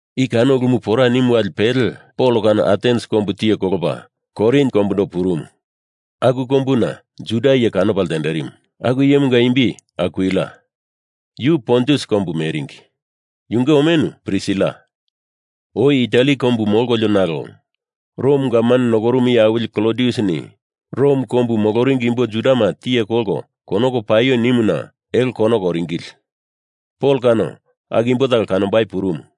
I kano ulumu pora nimu wali pele Pol kano Atens kombu tiye kolopa Korin kombundo purumu. Aku kombuna Juda iye kanopa ltenderimu, aku iyemunga imbi Akwila. Yu Pontus kombu meringi. Yunge omenu Prisila. Oi Itali kombu molkolio, nalo Rom gavman nokorumu iye awili Klodiusini Rom kombu moloringi imbo Judama tiye kolko konoko paio nimuna elo konoko oringili. Pol kano aku imbo talo kanombai purumu.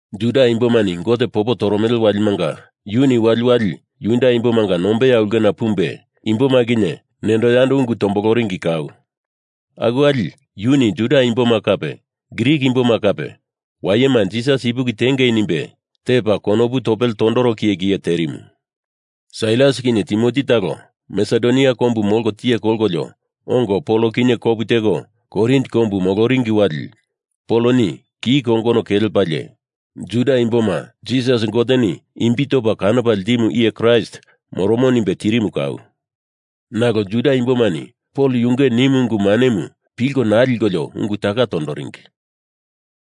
Juda imbomani Gote popo toromele walimanga yuni waliwali Juda imbomanga nombeya ulkena pumbe imboma kinye nendo yando ungu tomboloringi kau. Aku wali yuni Juda imboma kape Grik imboma kape wayema Jisas ipuki tiengei nimbe tepa konopu topele tondoro kiye kiye terimu. Sailas kinye Timoti talo Masedonia kombu molko tiye kolkolio ongo Pol kinye kopu teko Korin kombu moloringi wali Poloni ki kongono kelepalie Juda imboma Jisas Goteni imbi topa kanopa ltimu iye Kraist moromo nimbe tirimu kau. Nalo Juda imbomani Pol yunge nimu ungu manemu pilko naa likolio ungu taka tondoringi.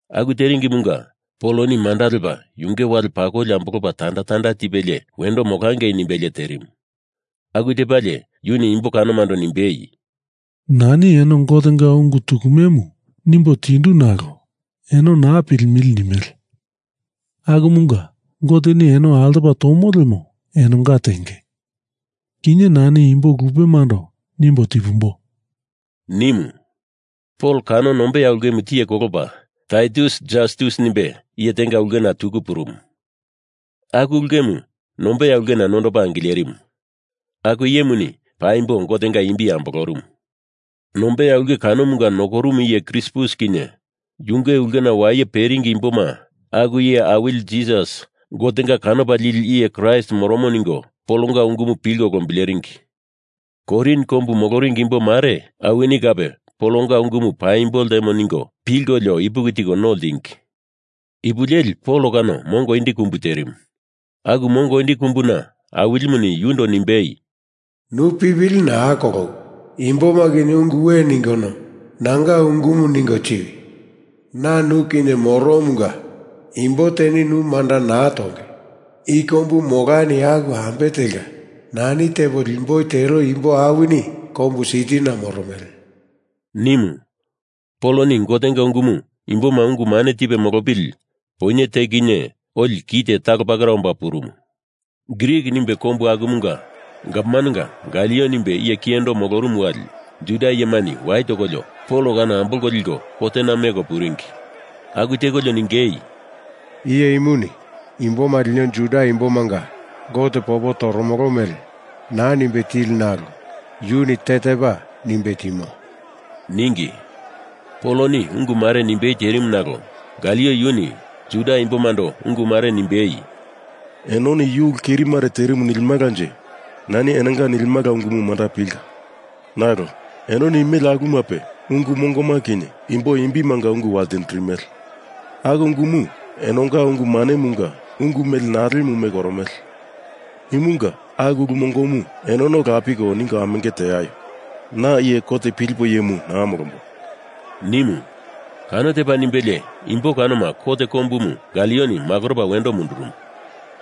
Aku teringimunga Poloni manda lepa yunge wale pakoli ambolopa tanda tanda tipelie wendo molangei nimbelie terimu. Aku tepalie yuni imbo kanomando nimbei, “Nani eno Gotenga ungu tukumemu nimbo tindu nalo eno naa pilimili nimele. Akumunga Goteni eno altopa tomo lemo enonga tenge. Kinye nani imbo lupemando nimbo tipumboi,” nimu. Pol kano nombeya ulkemu tiye kolopa Taitus Jastus nimbe iye tenga ulkena tuku purumu. Aku ulkemu nombeya ulkena nondopa angilerimu. Aku iyemuni paimbo Gotenga imbi ambolorumu. Nombeya ulke kanomunga nokorumu iye Krispus kinye yunge ulkena waye peringi imboma aku Iye Awili Jisas Gotenga kanopa lili iye Kraist moromo ningo Polonga ungumu pilko lombileringi. Korin kombu moloringi imbo mare awini kape Polonga ungumu paimbo ltemo ningo pilkolio ipuki tiko no ltingi. Ipu leli Pol kano mongo indi kumbu terimu. Aku mongo indi kumbuna Awilimuni yundo nimbei, “Nu pipili naa kolowi. Imboma kinye ungu we ningono, nanga ungumu ningo tiwi. Na nu kinye moromunga imbo teni nu manda naa tonge. I kombu molani aku ambe telka nani tepo limboi tero imbo awini kombu sitina moromele,” nimu Poloni Gotenga ungumu imboma ungu mane tipe molopili poinye te kinye oli kite talo pakera omba purumu. Grik nimbe kombu akumunga gavmanenga Galio nimbe iye kiyendo molorumu wali Juda iyemani wai tokolio Pol kano ambolko liko kotena meko puringi. Aku tekolio ningei, “Iye imuni imboma lino Juda imbomanga Gote popo toromolo mele naa nimbe tili nalo yuni tetepa nimbe timo,” ningi. Poloni ungu mare nimbei terimu nalo Galio yuni Juda imbomando ungu mare nimbei, “Enoni yu ulu keri mare terimu nilimalanje nani enonga nilimala ungumu manda pilka. Nalo enoni nimele aku ulumape ungu mongoma kinye imbo imbimanga ungu waltindirimele. Aku ungumu enonga ungu manemunga ungu mele nalemu meko oromele. Imunga aku ulu mongomu enono lapiko ningo amenge teaio. Na iye kot pilipo iyemu naa molombo,” nimu. Kano tepa nimbelie imbo kanoma kot kombumu Galioni makoropa wendo mundurumu.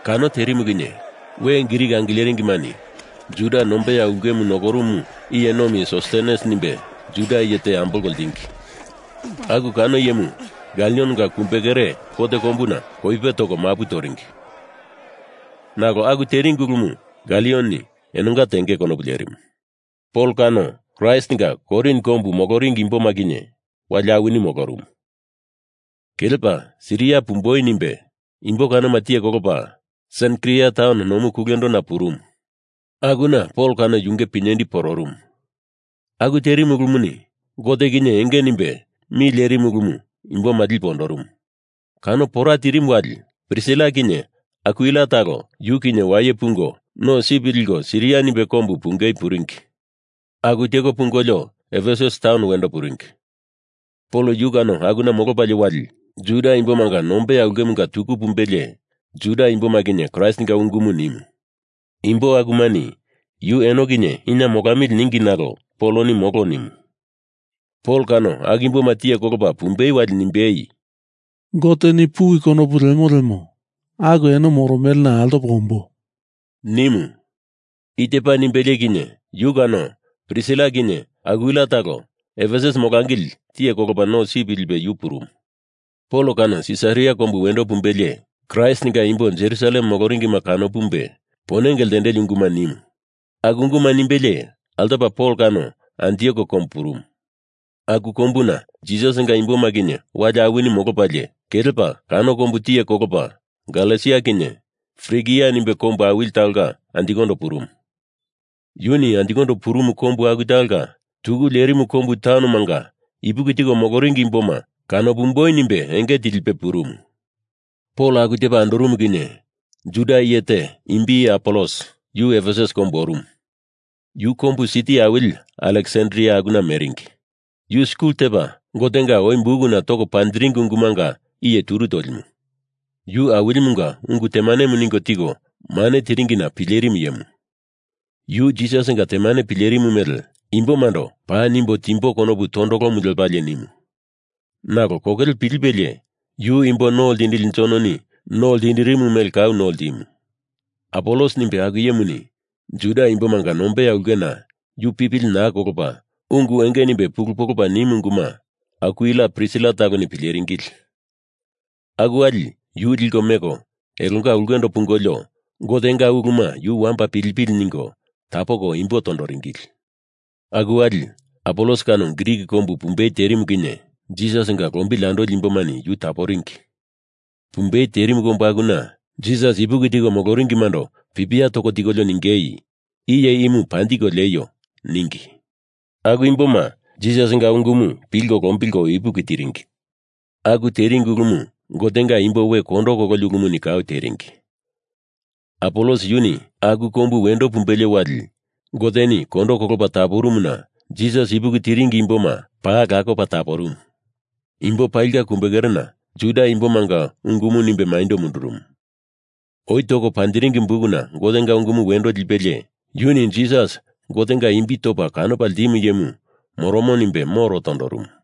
Kano terimu kinye we Grik angileringimani Juda nombeya ulkemu nokorumu iye nomi Sostenes nimbe Juda iye te ambolko ltingi. Aku kano iyemu Galionga kumbekere kot kombuna koipe toko mapu toringi. Nalo aku teringi ulumu Galioni enonga tenge konopu lerimu. Pol kano Kraistinga Korin kombu moloringi imboma kinye wali awini molorumu. Kelepa Siria pumboi nimbe imbo kanoma tiye kolopalie Senkria taun nomu kulendona purumu. Akuna Pol kano yunge pinyendi pororumu. Aku terimu ulumuni Gote kinye enge nimbe mi lerimu ulumu imboma lipe ondorumu. Kano pora tirimu wali Prisila kinye Akwila talo yu kinye waye pungo no sip liko Siria nimbe kombu pungei puringi. Aku teko pungolio Efesus taun wendo puringi. Pol yu kano akuna molopalie wali Juda imbomanga nombeya ulkemunga tuku pumbelie Juda imboma kinye Kraistinga ungumu nimu. Imbo akumani yu eno kinye ina molamili ningi nalo Poloni molo nimu. Pol kano aku imboma tiye kolopa pumbei wali nimbei, “Goteni puwi konopu lemo lemo aku eno moromelena altopo ombo,” nimu. I tepa nimbelie kinye yu kano Prisila kinye Akwila talo Efesus molangili tiye kolopa no sip lipe yu purumu. Pol kano Sisaria kombu wendo pumbelie Kraistinga imbo Jerusalem moloringima kano pumbe ponenge ltendeli unguma nimu. Aku unguma nimbelie altopa Pol kano Antiok kombu purumu. Aku kombuna Jisasinga imboma kinye wali awini molopalie kelepa kano kombu tiye kolopa Galesia kinye Frigia nimbe kombu awili talonga anjikondo purumu. Yuni anjikondo purumu kombu aku talonga tuku lerimu kombu taunomanga ipuki tiko moloringi imboma kanopumboi nimbe enge tilipe purumu. Pol aku tepa andorumu kinye Juda iye te imbi Apolos, yu Efesus kombu orumu. Yu kombu siti awili Aleksandria akuna meringi. Yu skul tepa Gotenga oi bukuna toko panjiringi ungumanga iye turu tolimu. Yu Awilimunga ungu temanemu ningo tiko mane tiringina pilerimu iyemu. Yu Jisasinga temane pilerimu mele imbomando paa nimbo timboi konopu tondolomu lepalie nimu. Nalo kokele pilipelie yu imbo no ltindili Jononi no ltindirimu mele kau no ltimu. Apolos nimbe aku iyemuni Juda imbomanga nombeya ulkena yu pipili naa kolopa ungu enge nimbe pulu polopa nimu unguma Akwila Prisila taloni pileringili. Aku wali yu liko meko elonga ulkendo pungolio Gotenga uluma yu wamba pilipili ningo tapoko imbo tondoringili. Aku wali Apolos kano Grik kombu pumbei terimu kinye Jisasinga lombili andoli imbomani yu taporingi. Pumbei terimu kombu akuna Jisas ipuki tiko moloringimando pipia toko tikolio ningei, “Iye imu panjiko lieio,” ningi. Aku imboma Jisasinga ungumu pilko lombilko ipuki tiringi. Aku teringi ulumu Gotenga imbo we kondo kololi ulumuni kau teringi. Apolos yuni aku kombu wendo pumbelie wali Goteni kondo kolopa taporumuna Jisas ipuki tiringi imbo akuma paa lakopa taporumu. Imbo palinga kumbekerena Juda imbomanga ungumu nimbe maindo mundurumu. Oi toko panjiringi bukuna Gotenga ungumu wendo lipelie yuni Jisas Gotenga imbi topa kanopa ltimu iyemu moromo nimbe moro tondorumu.